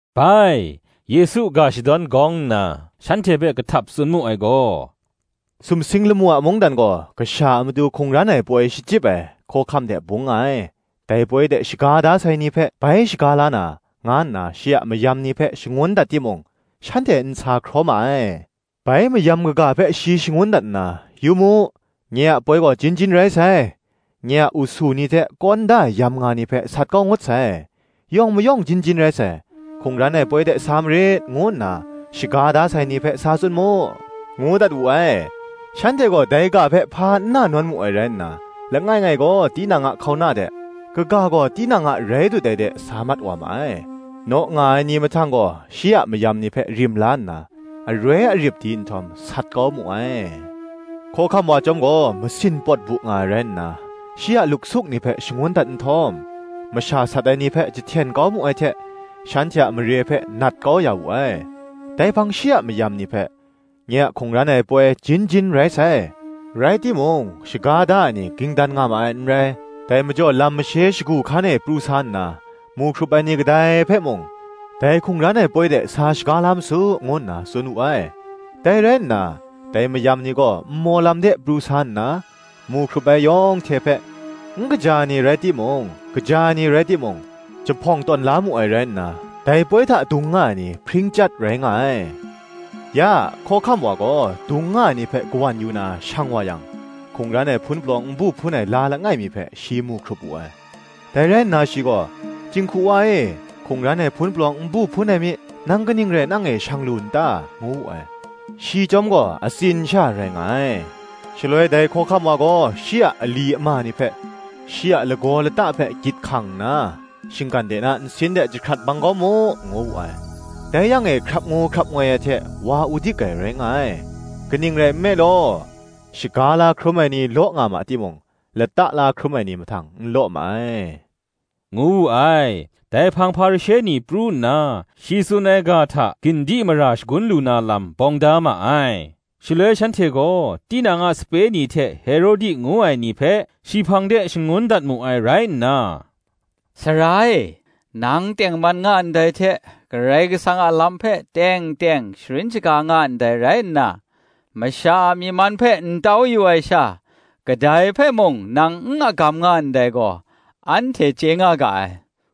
Bai, Yesu ga shadawn hku nna, shanhte hpe kahtap tsun mu ai gaw, “Sumsing lamu a mungdan gaw, kasha a matu hkungran ai poi shachyip ai hkawhkam hte bung nga ai: dai poi de shaga da sai ni hpe bai shaga la na, nga nna shi a mayam ni hpe shangun dat timung, shanhte n sa hkraw ma ai. Bai mayam kaga hpe shi shangun dat nna, ‘Yu mu, nye a poi gaw jin jin rai sai; nye a usu ni hte kawn da ai yamnga ni hpe sat kau ngut sai; yawng mayawng jin jin rai sai: hkungran ai poi de sa marit,’ ngu nna shaga da sai ni hpe sa tsun mu,” ngu dat wu ai. Shanhte gaw dai ga hpe hpa n na nawn mu ai rai nna, langai ngai gaw tinang a hkauna de, kaga gaw tinang a rai dut ai de sa mat wa ma ai. Naw nga ai ni mahtang gaw, shi a mayam ni hpe rim la nna, aroi arip di nhtawm, sat kau mu ai. Hkawhkam wa chyawm gaw masin pawt bu nga ai rai nna, shi a luksuk ni hpe shangun dat nhtawm, masha sat ai ni hpe jahten kau mu ai hte shanhte a mare hpe nat kau ya wu ai. Dai hpang shi a mayam ni hpe, “Nye a hkungran ai poi jin jin rai sai, rai timung, shaga da ai ni ging dan nga ma ai n rai: dai majaw lam mashe shagu hkan e pru sa nna, mu hkrup ai ni kadai hpe mung, dai hkungran ai poi de sa shaga la ma su,” ngu nna tsun wu ai. Dai rai nna, dai mayam ni gaw nmaw lam de pru sa nna, mu hkrup ai yawng hte hpe, n kaja ai ni rai timung, kaja ai ni rai timung, jahpawng tawn la mu ai rai nna, dai poi hta dung nga ai ni hpring chyat rai nga ai. Ya, hkawhkam wa gaw dung nga ai ni hpe kawan yu na, shang wa yang, hkungran ai hpun palawng n bu hpun ai la langai mi hpe, shi mu hkrup wu ai. Dai rai nna shi gaw, “Jinghku wa e, hkungran ai hpun palawng n bu hpun ai mi, nang kaning rai nang e shang lu n ta?” ngu wu ai: shi chyawm gaw atsin sha rai nga ai. Shaloi dai hkawhkam wa gaw shi a ali ama ni hpe, “Shi a lagaw lata hpe gyit hkang nna, shinggan de na nsin de jahkrat bang kau mu,” ngu wu ai: dai yang e hkrap ngu hkrap ngoi ai hte wa udik ai rai nga ai. “Kaning rai nme law, shaga la hkrum ai ni law nga ma timung, lata la hkrum ai ni mahtang n law ma ai,” ngu wu ai. Dai hpang Hparishe ni pru nna, shi tsun ai ga hta gin di mara shagun lu na lam, bawng da ma ai. Shaloi shanhte gaw, tinang a sape ni hte Herodi ngu ai ni hpe shi hpang de shangun dat mu ai rai nna, “Sara e, nang tengman nga ndai hte, Karai Kasang a lam hpe teng teng sharin shaga nga ndai rai nna, masha a myi man hpe n tau yu ai sha, kadai hpe mung nang n agam nga ndai gaw, anhte chye nga ga ai: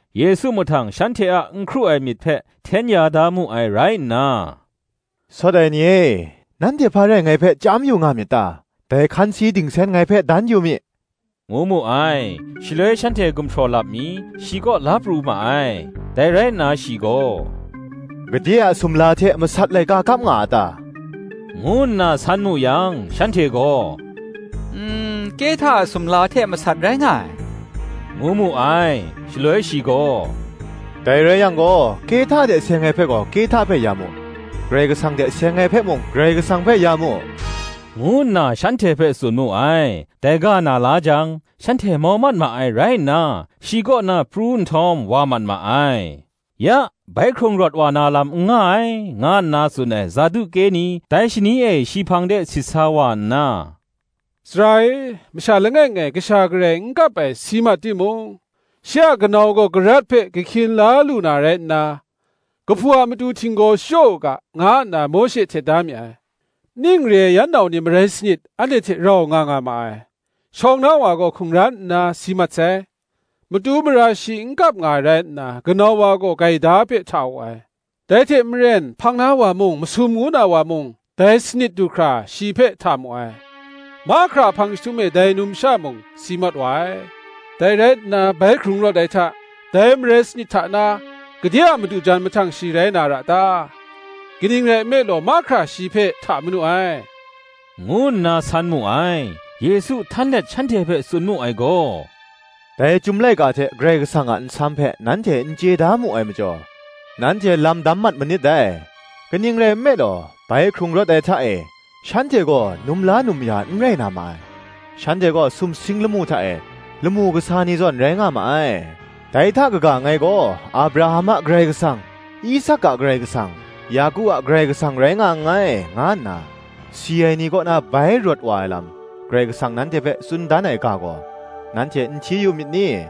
Yesu mahtang shanhte a n hkru ai myit hpe hten ya da mu ai rai nna, “Sawt ai ni e, nanhte hpa rai ngai hpe chyam yu nga myit ta? dai hkansi dingsen ngai hpe dan yu mi,” ngu mu ai. Shaloi shanhte gumhpraw lap mi, shi kaw la pru ma ai. Dai rai nna shi gaw, “Gade a sumla hte masat laika kap nga a ta?” ngu nna san mu yang, shanhte gaw, “Kehta a sumla hte masat rai nga ai,” ngu mu ai. Shaloi shi gaw, Dai rai yang gaw, “Kehta hte seng ai hpe gaw, Kehta hpe ya mu; Karai Kasang hte seng ai hpe mung, Karai Kasang hpe ya mu,” ngu nna shanhte hpe tsun mu ai. Dai ga na la jang, shanhte mau mat ma ai rai nna, shi kaw na pru nhtawm wa mat ma ai. Ya, bai hkrung rawt wa na lam n nga ai, nga nna tsun ai Saduke ni dai shani e shi hpang de sit sa wa nna, “Sara e, masha langai ngai kasha garai n kap ai si mat timung shi a kanau gaw karat hpe kahkyin la lu na rai nna, kahpu a matu htinggaw shachyaw u ga,” nga nna Mawshe htet da mi ai. “Ning re ai yan nau ni marai sanit anhte hte rau nga nga ma ai: shawng na wa gaw hkungran nna si mat sai; matu mara shi n kap nga ai rai nna, kanau wa gaw gaida hpe hta wu ai: dai hte maren, hpang na wa mung, masum ngu na wa mung dai sanit du hkra shi hpe hta da mu ai. Mahkra a hpang jahtum e dai numsha mung si mat wa ai. Dai rai nna bai hkrung rawt ai hta, dai marai sanit hta na, gade a madu jan mahtang shi rai na ra ta?” kaning rai nme law, mahkra shi hpe hta manu ai, ngu nna san mu ai. Yesu htan let shanhte hpe tsun mu ai gaw, “Dai Chyum laika hte Karai Kasang a nsam hpe nanhte n chye da mu ai majaw, nanhte lam dam mat manit dai: kaning rai nme law, bai hkrung rawt ai hta e, shanhte gaw, num la num ya ai n rai na ma ai: shanhte gaw sumsing lamu hta e, lamu kasa ni zawn rai nga ma ai. Dai hta kaga, Ngai gaw Abraham a Karai Kasang, Isak a Karai Kasang, Yaku a Karai Kasang rai nga nngai, nga nna si ai ni kaw na bai rawt wa ai lam, Karai Kasang nanhte hpe tsun dan ai ga gaw, nanhte n hti yu myit ni?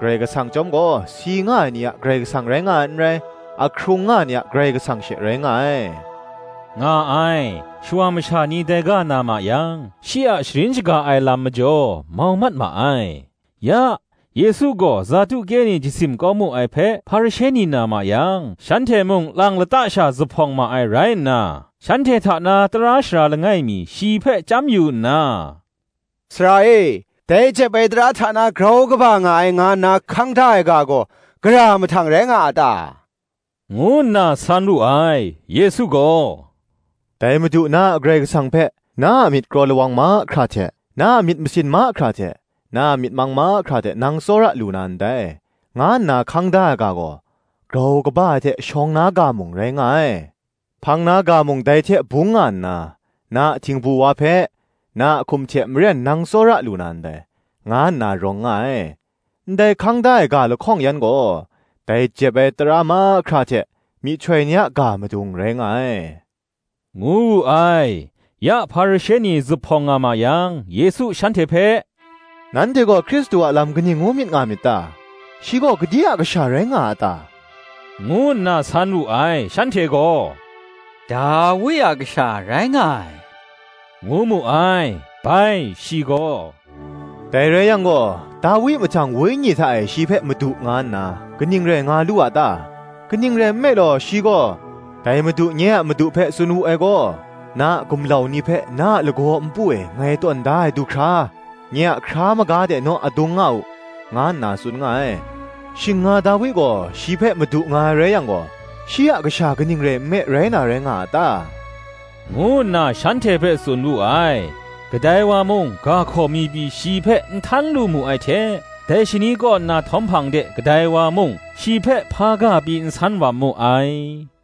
Karai Kasang chyawm gaw, si nga ai ni a Karai kasang rai nga ai n rai, ahkrung nga ai ni a Karai Kasang she rai nga ai,” nga ai. Shawa masha ni dai ga na ma yang, shi a sharin shaga ai lam majaw, mau mat ma ai. Ya, Yesu gaw Saduke ni jasim kau mu ai hpe Hparishe ni na ma yang shanhte mung lang lata sha zuphpawng ma ai rai nna, shanhte hta na tara sara langai mi shi hpe chyam yu nna, “Sara e, dai jep ai tara hta na grau kaba nga ai nga nna hkang da ai ga gaw, gara mahtang rai nga a ta?” ngu nna san wu ai. Yesu gaw, “Dai Madu, na a Karai Kasang hpe, na a myit kraw lawang mahkra hte, na a myit masin mahkra hte, na a myit mang mahkra hte nang tsawra lu na ndai, nga nna hkang da ai ga gaw, grau kaba ai hte shawng na ga mung, rai nga ai. Hpang na ga mung dai hte bung nga nna, Na a htingbu wa hpe, na a hkum hte maren nang tsawra lu na ndai, nga nna rawng nga ai. Ndai hkang da ai ga lahkawng yan gaw, dai jep ai tara mahkra hte, myihtoi ni a ga madung rai nga ai,” ngu wu ai. Ya Hparishe ni zuphpawng nga ma yang Yesu shanhte hpe, “Nanhte gaw Hkristu a lam kaning ngu myit nga myit ta? shi gaw gade a Kasha rai nga a ta?” ngu nna san wu ai. Shanhte gaw, Dawi a Kasha rai nga ai, ngu mu ai. Bai, shi gaw, “Dai rai yang gaw, Dawi mahtang wenyi hta e shi hpe Madu nga nna, kaning rai nga lu a ta? Kaning rai nme law, shi gaw, Dai Madu nye a Madu hpe tsun wu ai gaw: Na a gumlau ni hpe, na a lagaw npu e ngai tawn da ai du hkra, Nye a hkra maga de naw adung nga u,” nga nna tsun nga ai. “Shing nga Dawi gaw shi hpe Madu nga ai rai yang gaw, shi a kasha kaning rai nme rai na rai nga a ta?” ngu nna shanhte hpe tsun wu ai. Kadai wa mung, ga hkaw mi pyi shi hpe n htan lu mu ai hte, dai shani kaw nna htawm hpang de kadai wa mung shi hpe hpa ga pyi n san wam mu ai.